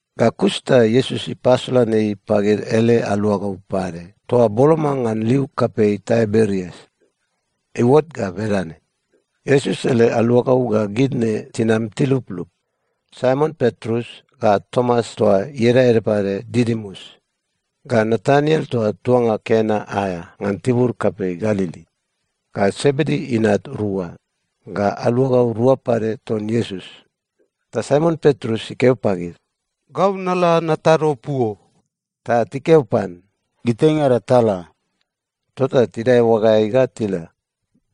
Ga kus ta Iesus ipasolan ei pagid ele aluagau pade toa boloma ngan liu kapei Taiberias. Iuot ga bedane. Iesus ele aluagau ga gid ne tinam tiluplup: Saimon Petrus, ga Tomas toa ieda ede pade Didimus, ga Nataniel toa tuanga Kena aea ngan tibur kapei Galili, ga Sebedi inat rua, ga aluagau rua pade ton Iesus. Ta Saimon Petrus ikeo pagid, “Gau nala natado puo.” Ta tikeo pan, “Gitaingada tala.” Tota tidae oagaeai ga tila,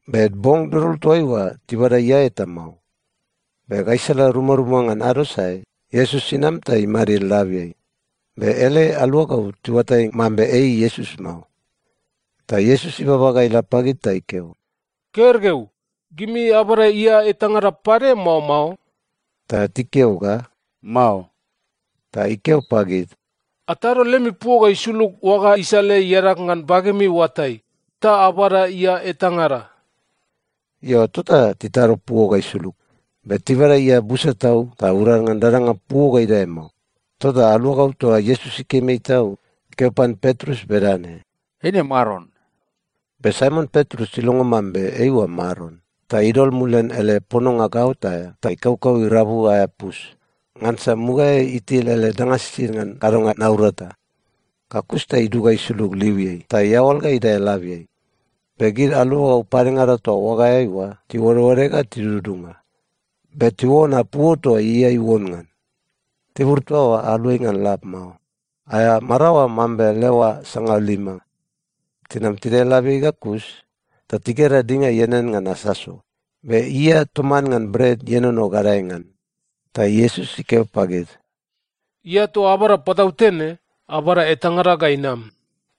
be bong dodol toaiua tibada ia eta mao. Be gaisala rumaruma ngan ado sae, Iesus inam ta imadid labiai. Be ele aluagau tiuatai mambe ei Iesus mao. Ta Iesus ibaba ga ila pagid ta ikeo, “Gergeu, gimi abada ia etangada pade, mao mao?” Ta tikeo ga, “Mao.” Ta ikeo pagid, “Atado lemi puo ga isulug oaga isaleai iadag ngan bagemi oatai, ta abada ia etangada.” Io, tota titado puo ga isulug, be tibada ia busa tau ta urad ngan dadanga puo ga idae mao. Tota aluagau toa Iesus ikim ei tau ikeo pan Petrus bedane, “Eine Maron.” Be Saimon Petrus ilongo mambe eiua Maron, ta idol mulian ele pononga gaot aea ta ikaukau irabu aea pus, ngansa mugaeai itil ele danga sisid ngan kadonga naurata. Ga kus ta idug ga isulug liuiai ta iaoal ga idae labiai. Be gid aluagau padengada toa oagaeai oa tiuodeode ga tidudunga. Be tiuona puo toa ia iuon ngan. Tibur toa oa aluai ngan lab mao, aea maraoa mambe leoa sangalima. Tinam tidae labiai ga kus ta tigera dinga ianean ngan asaso be ia toman ngan bret ienono gadae ngan. Ta Iesus ikeo pagid, “Ia toa abada patautene, abada etangada ga inam.”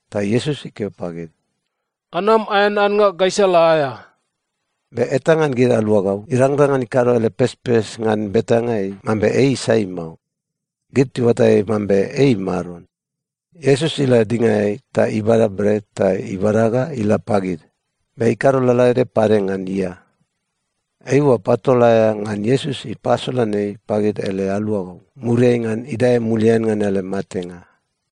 Ta Iesus ikeo pagid, “Anam aean annga gaisala aea.” Be eta ngan gid aluagau irangrang ngan ikado ele pespes ngan betanga ei mambe ei sai mao. Gid tiuatai mambe ei Maron. Iesus ila dingaeai ta ibada bret ta ibada ga ila pagid. Be ikado lalaede pade ngan ia. Eiua patol aea ngan Iesus ipasolan ei pagid ele aluagau, muriai ngan idae mulian ngan ele matenga.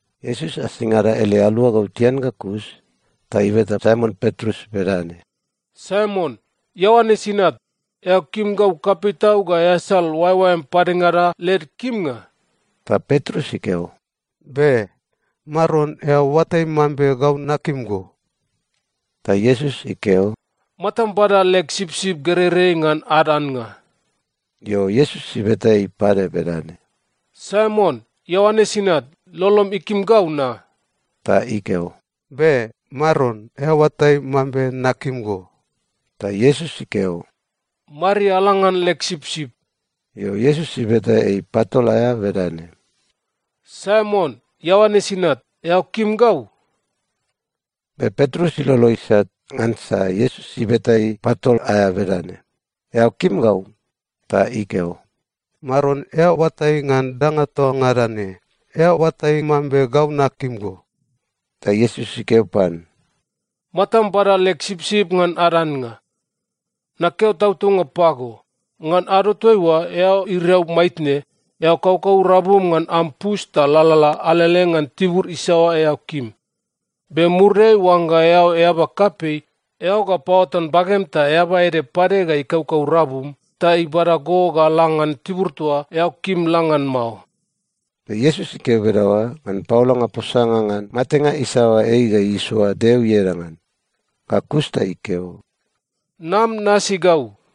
Iesus asingada ele aluagau tian ga kus ta ibeta Saimon Petrus bedane, “Saimon, Ioanes inat, eao kim gau kapei tau ga easal oaeoaem padengada led kimnga?” Ta Petrus ikeo, “Be. Maron, eao oatai mambe gau nakim go.” Ta Iesus ikeo, “Matam bada leg sipsip gereirei ngan ad annga.” Io, Iesus ibeta ei pade bedane, “Saimon, Ioanes inat, lolom ikim gau na?” Ta ikeo, “Be. Maron, eao oatai mambe nakim go.” Ta Iesus ikeo, “Mariala ngan leg sipsip.” Io, Iesus ibeta ei patol aea bedane, “Saimon, Ioanes inat, eao kim gau?” Be Petrus ilolo isat ngansa Iesus ibeta ei patol aea bedane, “Eao kim gau?” Ta ikeo, “Maron, eao oatai ngan danga toa ngada ne. Eao oatai mambe gau nakim go.” Ta Iesus ikeo pan, “Matam bada leg sipsip ngan ad annga. Nakeo tautaunga pago, ngan ado toaiua eao iriau maitne, eao kaukau rabum ngan am pus ta lalala alele ngan tibur isaoa eao kim. Be muriai oangga eao eaba kapei, eao ga paoatan bagem ta eaba ede pade ga ikaukau rabum ta ibada go ga la ngan tibur toa eao kim la ngan mao.” Be Iesus ikeo bedaoa ngan paolanga posanga ngan matenga isaoa ei ga isoa Deo ieda ngan. Ga kus ta ikeo, “Nam nasi gau.”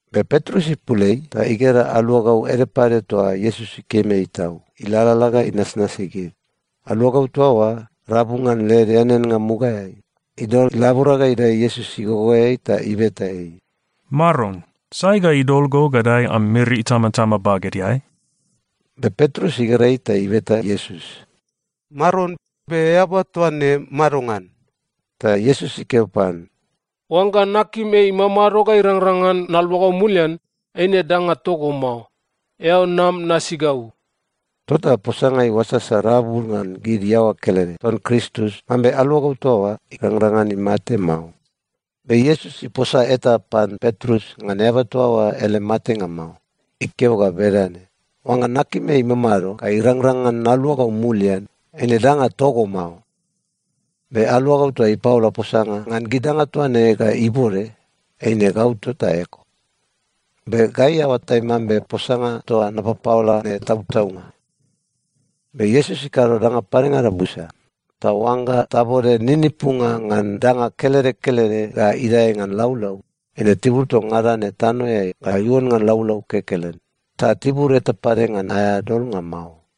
Be Petrus ipul ei ta igera aluagau ede pade toa Iesus ikim ei tau, ilalala ga inasnasi gid. Aluagau toa oa, rabu ngan led eaneannga mugaeai, idol ilabora ga idae Iesus igogoeai ta ibeta ei, “Maron, sai ga idol go ga dae am miri itamatama bagedeai?” Be Petrus igera ei ta ibeta Iesus, “Maron, be eaba toa ne madongan?” Ta Iesus ikeo pan, “Oangga nakim ei imamado ga irangrang ngan naluagau mulian, eine danga togo mao. Eao nam nasi gau.” Tota posanga iuasasa rabu ngan gid iaoa kelede ton Kristus mambe aluagau toa oa irangrang ngan imate mao. Be Iesus iposa eta pan Petrus ngan eaba toa oa ele matenga mao. Ikeo ga bedane, “Oangga nakim ei imamado ga irangrang ngan naluagau mulian, eine danga togo mao.” Be aluagau toa ipaola posanga ngan gid danga toa ne ga ibode, eine gau tota eko. Be gai aoatai mambe posanga toa napapaola ne tautaunga. Be Iesus ikado danga padengada busa. Ta oangga tabode ninipunga ngan danga kelede kelede ga idae ngan laulau, eine tibur toa ngada ne tanoeai ga iuon ngan laulau kekelen, ta tibur eta pade ngan aea dolnga mao.